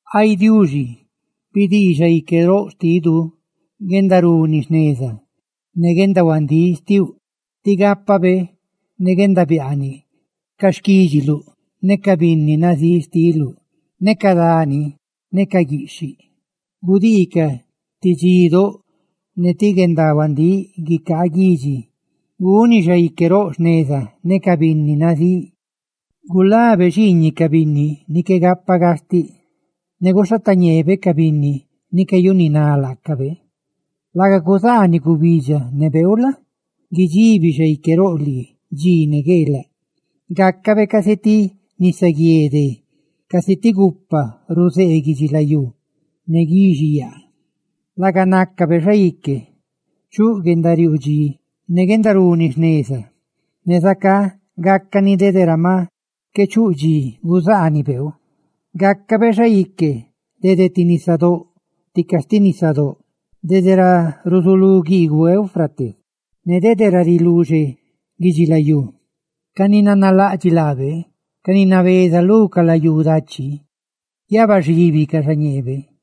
Ay Diuxi, bidii xaique roꞌ xtidu, guendaruni jneza ne guendahuandíꞌ xtiuꞌ, tí gápabe ne guendabiaaniꞌ ca xquídxiluꞌ ne ca binni nazíꞌ xtiluꞌ. Ca dani ne ca guiꞌxhiꞌ gudiicaꞌ ti dxidóꞌ ne ti guendahuandíꞌ guicaa guidxi. ¡Guni xaique roꞌ jneza ne ca binni nazíꞌ! ¡Gulabe xiiñiꞌ ca binni ni qué gapa gastiꞌ, ne guxhatañeebe ca binni ni cayanináꞌ laacabe! ¡Laga cuzaaniꞌ gubidxa ne beeu la? guidxibi xaique roꞌ lii dxi ne gueelaꞌ! ¡Gácabe casi ti nisaguié dé ne gupa ni ruzee guidxilayú ne guixiyaa! ¡Laga nácabe xaique chuꞌ guendariuu dxi ne guendaruni jneza, ne zacá gácani dede ra maꞌ qué chuu dxi guzaaniꞌ beeu! ¡Gácabe xaique dede lu ti nisadóꞌ ne sti nisadóꞌ dede ra ruzulú guiiguꞌ Éufrates ne de ra riluxe guidxilayú! ¡Ca ni nanalaꞌdxiꞌ laabe, ca ni nabeza lu ca layú dachi, guiabaxíbicaꞌ xañeebe!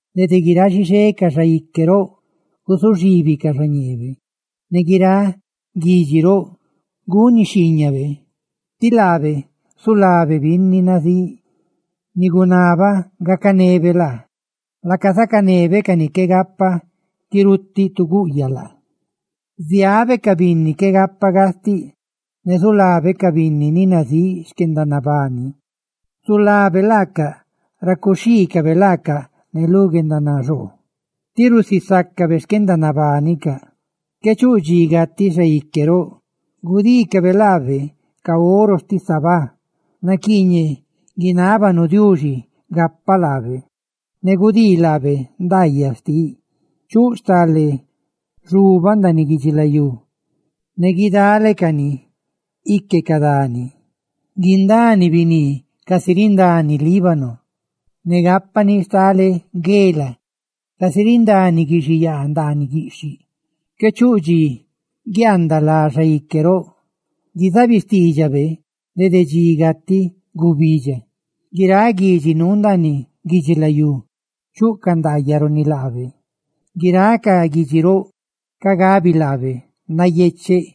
¡Dede guiráꞌ xixé ca xaique roꞌ guzuxibicaꞌ xa ñeebe! ¡Ne guiráꞌ guidxi roꞌ guni xhiiñabe! Tí laabe zulabe binni nazíꞌ ni guinabaꞌ gacanebe laa, laaca zacanebe ca ni qué gapa guirutiꞌ tu guꞌyaꞌ laa. Ziabe ca binni qué gapa gastiꞌ, ne zulabe ca binni ni nazíꞌ xquendanabani. Zulabe laacaꞌ ra cuxhiicabe laacaꞌ ne lu guendanaxoo, tí rusisácabe xquendanabanicaꞌ. ¡Qué chuꞌ dxi gatiꞌ xaique roꞌ! ¡Gudiicabe laabe ca oro xtiꞌ Sabá! ¡Naquiiñeꞌ guinábanu Diuxi gapaꞌ laabe! ¡Ne gudii laabe ndaayaꞌ xtiꞌ! ¡Chuꞌ stale xubaꞌ ndaaniꞌ guidxilayú, ne guidalecani ique ca dani! ¡Guindani biní casi rindani Líbano, ne gápani stale guela casi rindani guixiyaa ndaaniꞌ guiꞌxhiꞌ! ¡Qué chuꞌ dxi guiaandaꞌ lá xaique roꞌ; guizaabiꞌ xtiidxabe dede dxi gatiꞌ gubidxa! ¡Guiráꞌ guidxi nuu ndaaniꞌ guidxilayú chuꞌcaꞌ ndaayaꞌ runi laabe! ¡Guiráꞌ ca guidxi roꞌ ca gabi laabe nayecheꞌ!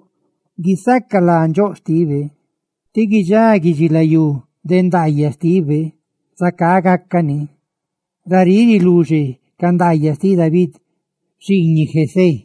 qué guiaanadxí de guisaca lá nandxóꞌ xtibe. ¡Tí guidxá guidxilayú de ndaayaꞌ xtibe! ¡Zacá gácani! Raríꞌ riluxe ca ndaayaꞌ xtiꞌ David xiiñiꞌ Jesé.